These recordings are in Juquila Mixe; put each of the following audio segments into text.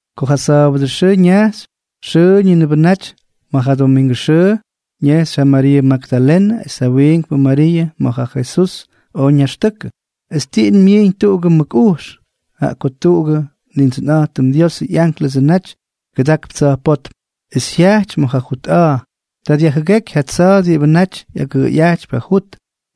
Ko ja sa̱a̱bʉdʉ xʉʉ ñajxy, xʉʉñʉbʉnʉ naty ma̱ ja domingʉ xʉʉ, ñejxy ja Mariiʉ Magdalenʉ es ja wiinkpʉ Mariiʉ ma̱ ja Jesús oj ñaxtʉkʉ. Es tiꞌin myiiñ tuꞌugʉ mʉk ujx, jaꞌa ko tuꞌugʉ Nindsʉnꞌa̱jtʉm Diosʉ ꞌyánklʉsʉ naty kʉdakp tsa̱jpótm, es jyajty ma̱ ja jut a̱a̱. Ta dyajjʉgéky ja tsa̱a̱ diꞌibʉ naty ꞌyagʉꞌʉyꞌajtypy ja jut,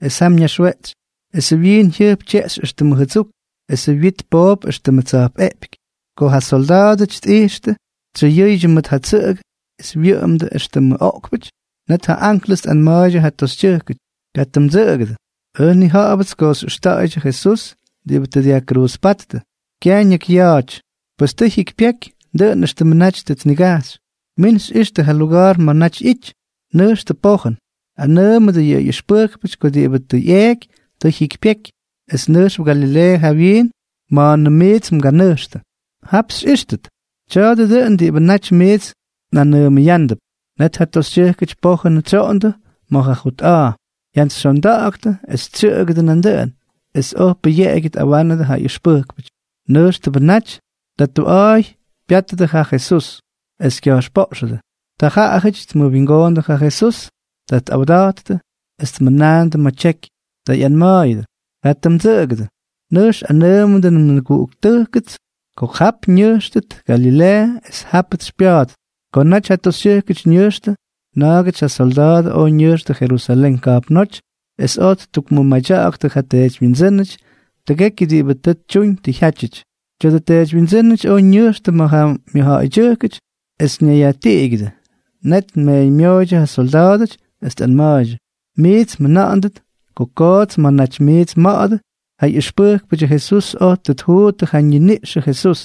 es jam ñaxweꞌtsy. Esʉ wyiin jyʉjp tyeꞌxy éxtʉmʉ jʉdsuk, esʉ wyit poop éxtʉmʉ tsa̱jpꞌeꞌpyky. Ko ja solda̱a̱dʉty tꞌijxtʉ, tsʉyʉʉydyʉ mʉt ja tsʉꞌʉgʉ es wyʉꞌʉmdʉ éxtʉmʉ oꞌkpʉty. Net ja anklʉs tꞌanma̱a̱ydyʉ ja toxytyʉjkʉty: —Katʉ mdsʉꞌʉgʉdʉ. Ʉj nnija̱ꞌa̱bʉts ko xyꞌʉxta̱ꞌa̱ydyʉ Jesús diꞌibʉ tʉ dyajkruuzpáttʉ. Kyaj ñakyya̱a̱ty, pes tʉ jyikypyeky, dʉꞌʉn éxtʉmʉ naty tʉ tnigajxy. Min xyꞌixtʉ ja luga̱a̱r ma̱ naty ꞌyity. Nʉjxtʉ pojʉn, anʉʉmʉdʉ yʉ ꞌyʉxpʉjkpʉty ko diꞌibʉ tʉ ꞌyeeky tʉ jyikypyeky, es nʉjxp Galileeʉ jawyiin ma̱a̱nʉm miits mganʉjxtʉ. Jap xyꞌíxtʉt. Tya̱a̱dʉ dʉꞌʉn diꞌibʉ naty miits nꞌanʉʉmʉyándʉp. Net ja toxytyʉjkʉty pojʉn tsyoꞌondʉ ma̱ ja jut a̱a̱, jyantsyxyondaktʉ es tsyʉꞌʉgʉdʉ nandʉꞌʉn, es oj pʉyeꞌegyʉ tꞌawánʉdʉ ja ʉxpʉjkpʉty. Nʉjxtʉbʉ naty, ta tuꞌa̱a̱y pyátʉdʉ ja Jesús, es kya̱jxpoꞌxʉdʉ. Ta jaꞌajʉty tmʉwingoondʉ ja Jesús. Ta tꞌawda̱jttʉ es tmʉnaandʉ ma̱ tyeky. Ta ꞌyanma̱a̱yʉdʉ: —Katʉ mdsʉꞌʉgʉdʉ. Nʉjx anʉʉmʉdʉ nmʉguꞌuktʉjkʉts ko jap ñʉjxtʉt Galileeʉ, es jápʉts xypya̱a̱ttʉt. Ko naty ja toxytyʉjk ñʉjxtʉ, na̱a̱gʉty ja solda̱a̱dʉ oj ñʉjxtʉ Jerusalén ka̱jpnóty es oj ttukmʉmadya̱ꞌa̱ktʉ ja teedywyindsʉ́nʉty tʉgekyʉ diꞌibʉ tʉ tyuñ tʉ jyátyʉty. Tya̱dʉ teedywyindsʉ́nʉty oj ñʉjxtʉ ma̱ ja mʉjja̱ꞌa̱ydyʉjkʉty es ñayyajtiꞌigyʉdʉ. Net tmeeñmyooydyʉ ja solda̱a̱dʉty, es tꞌanma̱a̱ydyʉ: —Miits mjʉna̱ꞌa̱ndʉt ko koots ma̱ naty miits mma̱ꞌa̱dʉ, ja ꞌyʉxpʉjkpʉdyʉ Jesús oj tʉ tjuuttʉ ja ñiniꞌxʉ Jesús.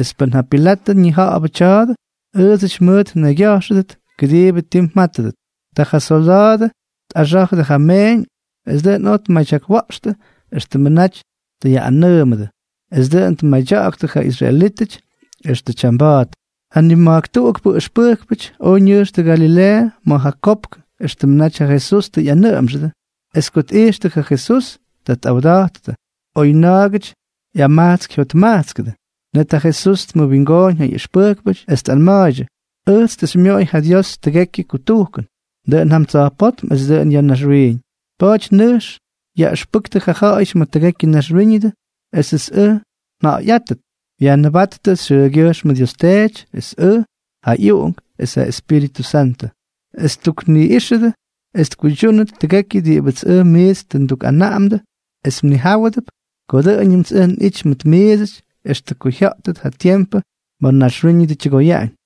Es pʉn ja Pilatʉ ñija̱ꞌa̱bʉ tya̱a̱dʉ, ʉʉdsʉty mʉʉt nnaygya̱jxʉdʉt kʉdiibʉ ti mjátʉdʉt. Ta ja solda̱a̱dʉ tꞌaxá̱jʉdʉ ja meeñ es dʉꞌʉn oj tmadyakwa̱ꞌxtʉ éxtʉmʉ naty tʉ yaꞌꞌanʉʉmʉdʉ. Es dʉꞌʉn tmadya̱ꞌa̱ktʉ ja israelítʉty extʉ tyamba̱a̱t. Ja nima̱jk tuꞌukpʉ ʉxpʉjkpʉty oj ñʉjxtʉ Galileeʉ ma̱ ja kopk éxtʉmʉ naty ja Jesús tʉ ꞌyanʉꞌʉmxʉdʉ. Es ko tꞌijxtʉ ja Jesús, ta tꞌawda̱jttʉ, oy na̱a̱gʉty ꞌyamajtsk jyotmajtskʉdʉ. Net ja Jesús tmʉwingooñ ja ꞌyʉxpʉjkpʉty es tꞌanma̱a̱ydyʉ: —Ʉjts tʉ xymyoꞌoy ja Dios tʉgekyʉ kutujkʉn, dʉꞌʉn jam tsa̱jpótm es dʉꞌʉn ya̱ naxwiiñ. Pa̱a̱ty nʉjx yaꞌʉxpʉktʉ ja̱ꞌa̱yʉty ma̱ tʉgekyʉ naxwíñʉdʉ esʉts ʉj nja̱ꞌa̱yꞌáttʉt. Yajnʉbáttʉ xyʉʉgyʉjxmʉ Dios Teety, es ʉj, ja ꞌyUꞌunk, es ja Espíritʉ Santʉ, es tukniꞌíxʉdʉ es tkuydyúnʉt tʉgekyʉ diꞌibʉts ʉj miits tʉ ndukꞌanaꞌamdʉ, es mnijáwʉdʉp ko dʉꞌʉñʉmts ʉj nꞌity mʉt miidsʉty extʉ ko jya̱ꞌtʉt ja tiempʉ ma̱ naxwíñʉdʉ tyʉgoyaꞌañ.